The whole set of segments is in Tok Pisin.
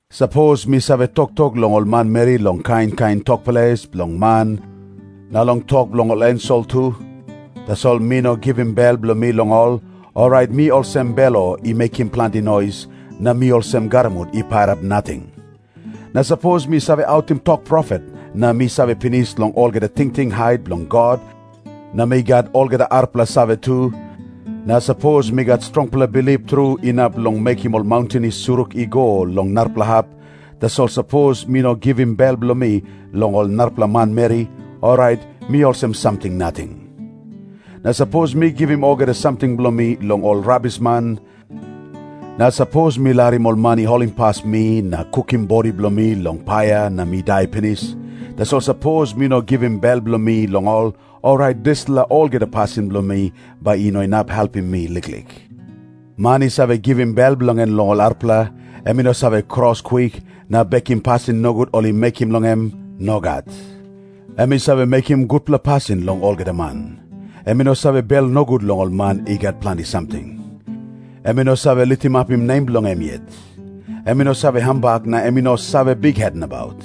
Sapos mi save toktok long ol manmeri long kain kain tok ples bilong man na long tok bilong ol ensel tu, tasol mi no givim bel bilong mi long ol, orait mi olsem belo i mekim planti nois, na mi olsem garamut i pairap nating. Na sapos mi save autim tok profet na mi save pinis long olgeta tingting hait bilong God na mi gat olgeta arapela save tu, na sapos mi gat strongpela bilip tru inap long mekim ol maunten i surik i go long narapela hap, tasol sapos mi no givim bel bilong mi long ol manmeri, orait mi olsem samting nating. Na sapos mi givim olgeta samting bilong mi long ol rabisman, na sapos mi larim ol man i holimpas mi na kukim bodi bilong mi long paia na mi dai pinis, tasol sapos mi no bin givim bel bilong mi long ol, orait dispela olgeta pasin bilong mi bai i no inap helpim mi liklik. Man i save givim bel bilong en long ol arapela, em i no save kros kwik na bekim pasin nogut ol i mekim long em. Nogat. Em i save mekim gutpela pasin long olgeta man. Em i no save bel nogut long ol man i gat planti samting. Em i no save litimapim nem bilong em yet. Em i no save hambak na em i no save bikhet nabaut.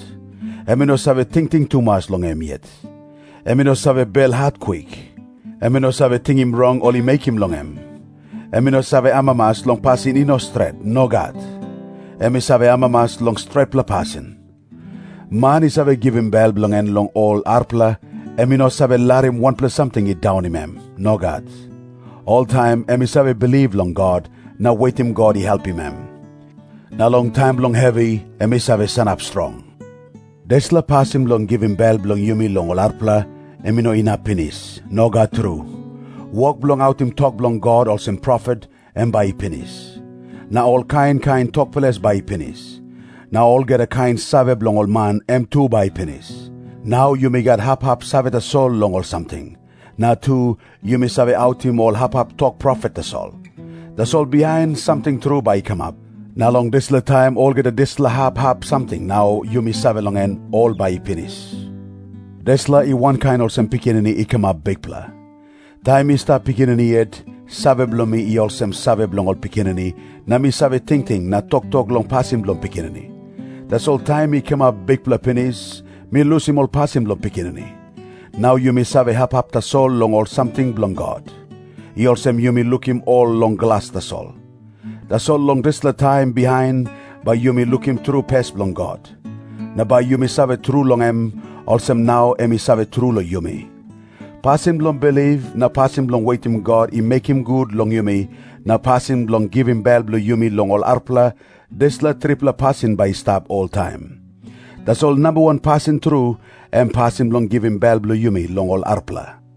Em i no save tingting tumas long em yet. Em i no save belhat kwik. Em i no save tingim rong ol i mekim long em. Em i no save amamas long pasin i no stret. Nogat. Em i save amamas long stretpela pasin. Man i save givim bel bilong en long ol arapela, em i no save larim wanpela samting i daunim em. Nogat. Oltaim em i save bilip long God na wetim God i helpim em. Na long taim bilong hevi em i save sanap strong. Dispela pasin bilong givim bel bilong yumi long ol arapela, em i no inap pinis. Nogat tru. Wok bilong autim tok bilong God olsem profet, em bai i pinis. Na ol kain kain tok ples bai i pinis. Na olgeta kain save bilong ol man, em tu bai i pinis. Nau yumi gat hap hap save tasol long ol samting. Na tu, yumi save autim ol hap hap tok profet tasol. Tasol bihain samting tru bai i kamap, na long dispela taim olgeta dispela hap hap samting nau yumi save long en, ol bai i pinis. Dispela i wankain olsem pikinini i kamap bikpela. Taim mi stap pikinini yet, save bilong mi i olsem save bilong ol pikinini, na mi save tingting na toktok long pasin bilong pikinini. Tasol taim mi kamap bikpela pinis, mi lusim ol pasin bilong pikinini. Nau yumi save hap hap tasol long ol samting bilong God. I olsem yumi lukim ol long glas tasol. Tasol long dispela taim bihain, bai yumi lukim tru pes bilong God. Na bai yumi save tru long em, olsem nau em i save tru long yumi. Pasin bilong bilip, na pasin bilong wetim God i mekim gut long yumi, na pasin bilong givim bel bilong yumi long ol arapela, dispela tripela pasin bai i stap oltaim. Tasol namba wan pasin tru, em pasin bilong givim bel bilong yumi long ol arapela.